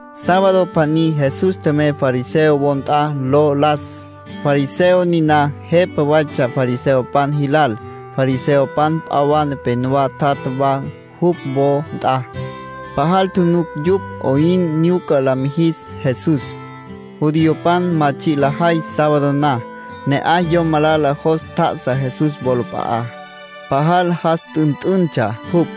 Sábado pjaní Jesús tjemey fariseo wo nt'a lo las. Fariseo niná jepa waytsja fariseopan jilal. Fariseopan p'a wa nepenowá tjatja wa jupj wo nt'a. Pajal tjunuc yupj 'oyn nyuca la mijis Jesús; judiopan ma tsji' lajay sábado na. Ne'aj yom malala jos tjá'asa Jesús wolap'a'á. Pajal jas t'ünt'üntsja jupj,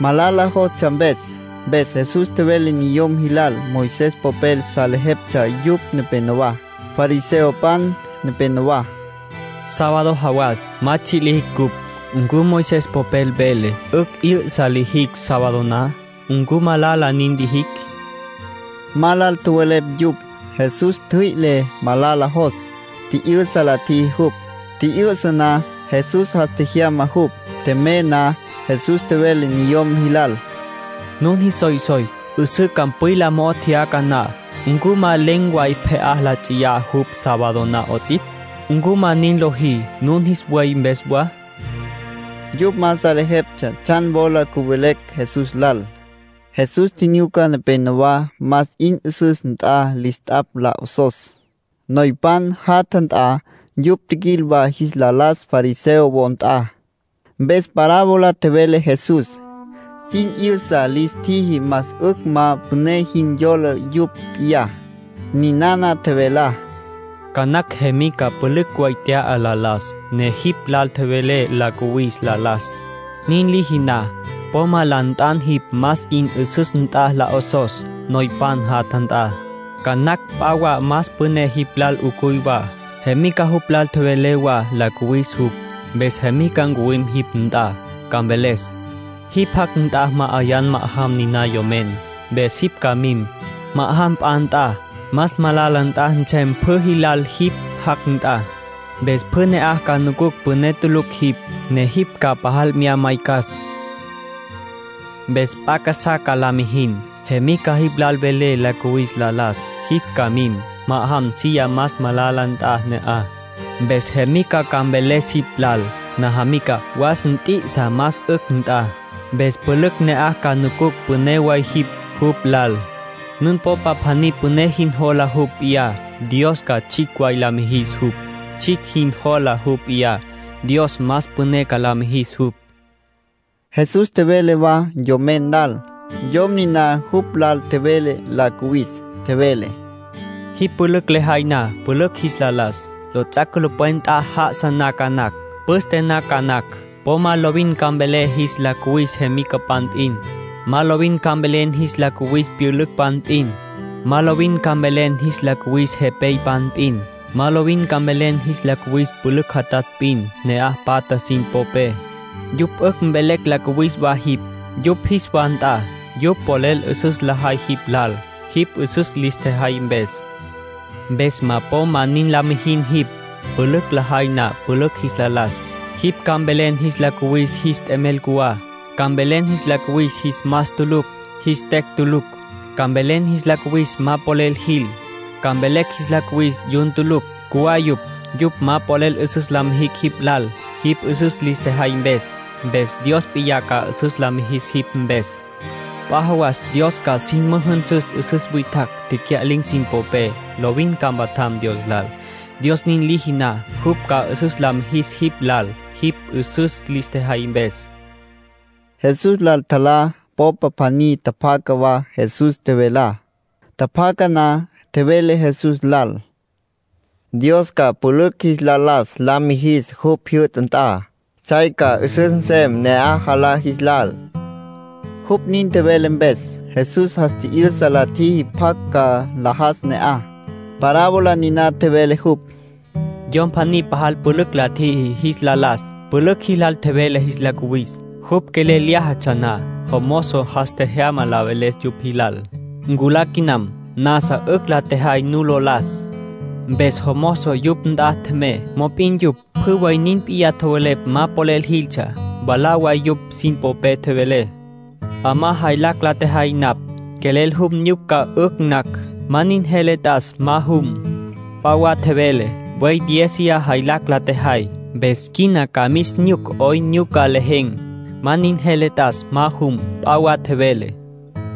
malala jostsja mpes. Mpes Jesús tjevele niyom jilal, Moisés popel salejeptsja yupj nepenowá, fariseopan nepenowá: —Sábado jawas ma tsji' lijicj cupj. ¿Ncu Moisés popel vele 'ücj 'yü'sa lijicj sábado na? ¿Ncu malala nin lijicj? Ma lal tjowelepj yupj. Jesús ntjüi'le malala jos, tji'yü'sa la tjiji jupj. Tji'yü'sa na, Jesús jas tjejyama jupj. Tjemey na, Jesús tjevele niyom jilal: —Nun jis soysoy 'üsǘ campwila mo'ó tjeyaca na ¿ncu ma len̈ way pje'á la nts'iyá jupj sábado na 'ots'ipj? ¿Ncu ma nin lojí nun jis buey mpes wa? Yupj ma salejeptsja tsjan wola cüvelecj Jesús lal. Jesús tjinyuca nepénowa más 'in 'üsüs nt'a lis t'apj la 'osos, noypan jatja nt'a. Yupj tjiquil wa jis la las fariseo wo nt'a. Mpes parábola tjevele Jesús; sin 'yüsa lis tjiji más 'ücj ma püné jin yola yupj p'iyá. Ninana tjevelá: —Ca nacj jemica pülücj way tya'a la las, ne jipj lal tjevele la cuwis la las. Nin liji na, po ma la nt'an jipj más 'in 'üsüs nt'a la 'osos, noypan jatja nt'a. Ca nacj p'a wa más püné jipj lal 'ucuy wa. Jemica jupj lal tjevele wa la cuwis jupj. Mpes jemica ncuwim jipj nt'a, ca mveles: ‘Jipj jac' nt'a ma'ayan ma'ajam niná yomen’. Mpes jipj ca mim, ma'ajam p'a nt'a. Más malala nt'a nsem pjü jilal jipj jac' nt'a. Mpes pjü ne'aj ca nucucj püné tulucj jipj, ne jipj ca pajal mya maycas. Mpes p'a casá ca la mijin. Jemica jipj lal vele la cuwis la las, jipj ca mim, ma'ajam silla más malala nt'a ne'aj. Mpes jemica ca mveles jipj lal: ‘Najamica, was, nt'i'isa más 'ücj nt'a’. Mpes pjü ne'aj ca nucucj püné way jipj jupj lal. Nun popa pjaní püné jin jola jupj p'iyá, Dios ca tsjicj way la mijis jupj. Tsjicj jin jola jupj p'iyá, Dios más püné ca la mijis jupj. Jesús tjevele wa yomen lal, yom niná jupj lal tjevele la cuwis. Tjevele: —Jipj pülücj lejay na pülücj jis la las, lots'ac' culupwen nt'a já'asa na ca nacj, püste na ca nacj, po ma lovin ca mvelen jis la cuwis jemicapan p'in. Ma lovin ca mvelen jis la cuwis pyülücpan p'in. Ma lovin ca mvelen jis la cuwis jepeypan p'in. Ma lovin ca mvelen jis la cuwis pülücj jatatj p'in, ne'aj patja sin popé. Yupj 'ücj mvelecj la cuwis wa jipj, yupj jis wa nt'a. Yupj polel 'üsüs lajay jipj lal, jipj 'üsüs lis tjejay mpes. Mpes po ma nin la mijin jipj. Pülücj lejay na pülücj jis la las, jipj ca mvelen jis la cuwis jis t'emel cjuwá. Ca mvelen jis la cuwis jis más tulucj, jis tecj tulucj. Ca mvelen jis la cuwis ma polel jil. Ca mvelen jis la cuwis yun tulucj. Cjuwá yupj. Yupj ma polel 'üsüs la mijicj jipj lal, jipj 'üsüs lis tjejay mpes. Mpes Dios p'iyá ca 'üsüs la mijis jipj mpes. P'a jawas Dios ca sin müjünsüs 'üsüs witjacj, tecya'lin̈ sin popé. Lovin ca mpatjam Dios lal. Dios nin liji na, jupj ca 'üsüs la mijis jipj lal, jipj 'üsüs lis tjejay mpes. Jesús lal tjalá popa pjaní tjapjaca wa Jesús tjevelá. Tjapjaca na, tjevele Jesús lal: —Dios ca pülücj jis la las la mijis jupj jyü'ta nt'a. Tsjay ca 'üsüs nsem ne'aj jalá jis lal. Jupj nin tjevele mpes, Jesús jas tji'yüsa la tjiji pjacj ca nlajas ne'aj. Parábola niná tjevele jupj: —Yom pjaní pajal pülücj la tjiji jis la las, pülücj jilal tjevele jis la cuwis. Jupj quelel lyájatsja na, jomozo jas tjejyama la veles yupj jilal: ‘Nculá quinam. Nasa 'ücj la tjejay nu lo las.’ Mpes jomozo yupj nt'a tjemey. Mop'in yupj pjü way nin p'iyá tjowelepj ma polel jiltsja. Mwalá way yupj sin popé tjevele: ‘'Amá jaylacj la tjejay napj. Quelel jum nyuc ca 'ücj nacj. Ma nin jele t'as ma jum.’ P'a wa tjevele: ‘Buey diéziya jaylacj la tjejay. Mpes quina ca mis nyuc 'oyn nyuca lejen̈. Ma nin jele t'as ma jum.’ P'a wa tjevele: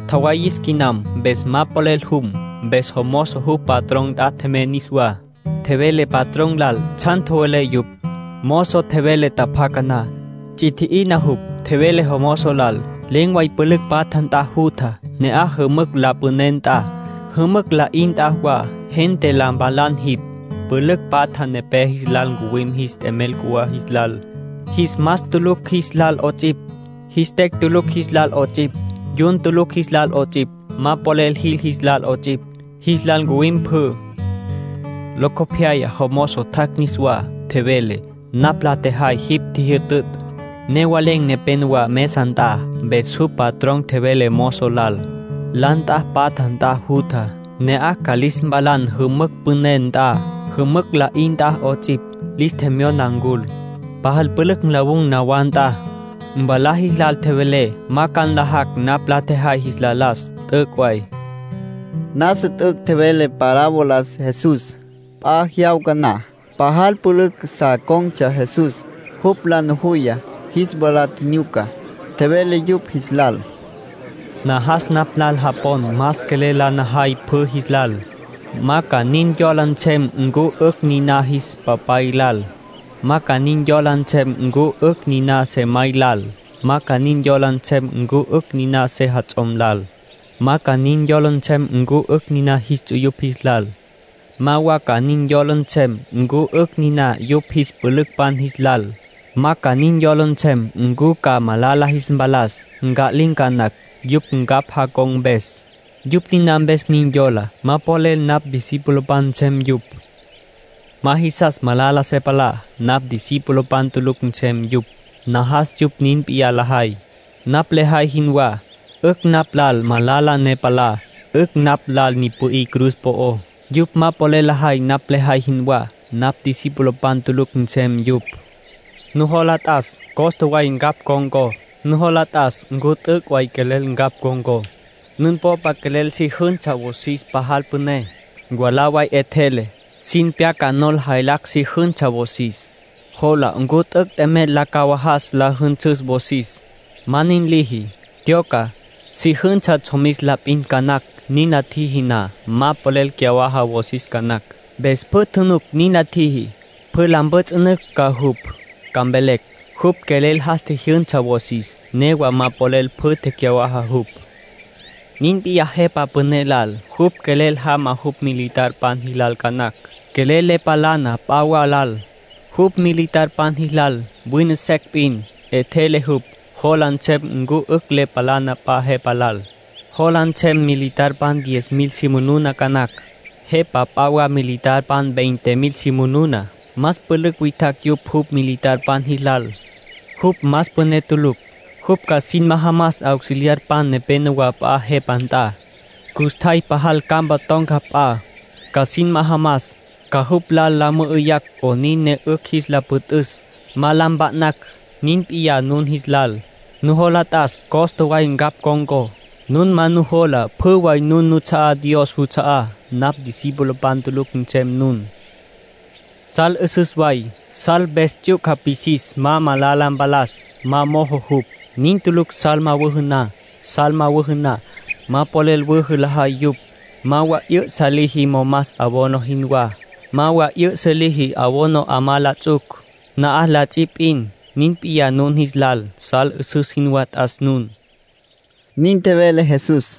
‘Tjawayis quinam, mpes ma polel jum’. Mpes jomozo jupj patrón nt'a tjemey niswá. Tjevele patrón lal tsjan tjowelepj yupj. Mozo tjevele tjapjaca na, ts'i tji'ina jupj. Tjevele jomozo lal: ‘Len̈ way pülücj patja nt'a jutja. Ne'aj jümücj la püné nt'a, jümücj la'í nt'a wa, gente la mpalan jipj. Pülücj patja nepé jis lal ncuwim jis t'emel cjuwá jis lal, jis mas tulucj jis lal 'ots'ipj, jis tecj tulucj jis lal 'ots'ipj, yun tulucj jis lal 'ots'ipj, ma polel jil jis lal 'ots'ipj. Jis lal ncuwim pjü.’ ”Locopyaya jomozo tjac' niswá. Tjevele: ‘Napj la tjejay jipj ntjijütütj. Newa len̈ nepenowá mesa nt'a.’ Mpes jupj patrón tjevele mozo lal: ‘La nt'a patja nt'a jutja. Ne'aj ca lis mpalan jümücj püné nt'a, jümücj la'í nt'a 'ots'ipj. Lis tjemyona ncul, pajal pülücj nlawun̈ nawá nt'a. Mwalá jilal tjevelé ma ca nlajacj napj la tjejay jis la las. T'üc' way.’ Nasa t'üc' tjevele parabolas Jesús. P'a jyawca na, pajal pülücj sa con̈tsja Jesús. Jupj la nujuya, jis wala tjinyuca, tjevele yupj jis lal: “Najas napj lal japon más quelel la najay pjü jis lal. Ma ca nin yola nsem ncu 'ücj niná jis papay lal. Ma ca nin yola nsem ncu 'ücj niná sejamay lal. Ma ca nin yola nsem ncu 'ücj niná sejats'om lal. Ma ca nin yola nsem ncu 'ücj niná jis ts'uyupj jis lal. Ma wa ca nin yola nsem ncu 'ücj niná yupj jis pülücpan jis lal. Ma ca nin yola nsem ncu ca malala jis mpalas, nca'lin̈ ca nacj, yupj ncapj jacon̈ mpes. Yupj niná mpes nin yolá, ma polel napj discipulopan nsem yupj. Ma jisas malala se palá, napj discipulopan tulucj nsem yupj. Najas yupj nin p'iyá lajay, napj lejay jinwá. 'Ücj napj lal malala ne palá. 'Ücj napj lal ni pü'í cruz po'ó. Yupj ma quelel lajay napj lejay jinwá, napj discipulopan tulucj nsem yupj. Nujola t'as costa way ncapj con̈có. Nujola t'as ncu t'üc' way quelel ncapj con̈có. Nun popa quelel si jünsa wosis pajal püné, mwalá way 'etjele, sin pyaca nol jaylacj si jünsa wosis. Jola ncu t'üc' t'emel la cawajas la jünsüs wosis. Ma nin liji, tyoca, si jünsa tsjomis la p'in ca nacj. Nin la tjiji na, ma polel cyawaja wosis ca nacj. Mpes pjü tjunuc nin la tjiji, pjü la mpjüts'ünücj ca jupj. Ca mvelecj: ‘Jupj quelel jas tjijyünsa wosis, newa ma polel pjü tecyawaja jupj’. ”Nin p'iyá jepa püné lal. Jupj quelel jama jupj militarpan jilal ca nacj. Quelel le palana p'a wa lal, jupj militarpan jilal. Wine secj p'in, 'etjele jupj, jola nsem ncu 'ücj le palana p'a jepa lal. Jola nsem militarpan diez mil si manuna ca nacj. Jepa p'a wa militarpan veinte mil si manuna, más pülücj witjacj yupj jupj militarpan jilal. Jupj más püné tulucj, jupj ca sin majamas auxiliarpan nepenowá p'a jepa nt'a. Custjay pajal campa ton̈ca p'a, ca sin majamas, ca jupj lal la mü'üyacj 'onin ne 'ücj jis la püt'üs, ma la mpa'nacj. Nin p'iyá nun jis lal. Nujola t'as costa way ncapj con̈có. Nun ma nin nujola pjü way nun nuts'a'á Dios juts'a'á, napj discipulopan tulucj nsem nun. ”Sal 'üsüs way. (Sal mpes ts'yuca pwisis, ma malala mpalas, ma mojo jupj.) Nin tulucj sal ma wüjü na. Sal ma wüjü na, ma polel wüjü lajay yupj. Ma wa 'yü'sa liji momas abono jinwá. Ma wa 'yü'sa liji abono 'amá la ts'uc. Na'aj la ts'i p'in. Nin p'iyá nun jis lal. Sal 'üsüs jinwá t'as nun”, nin tjevele Jesús.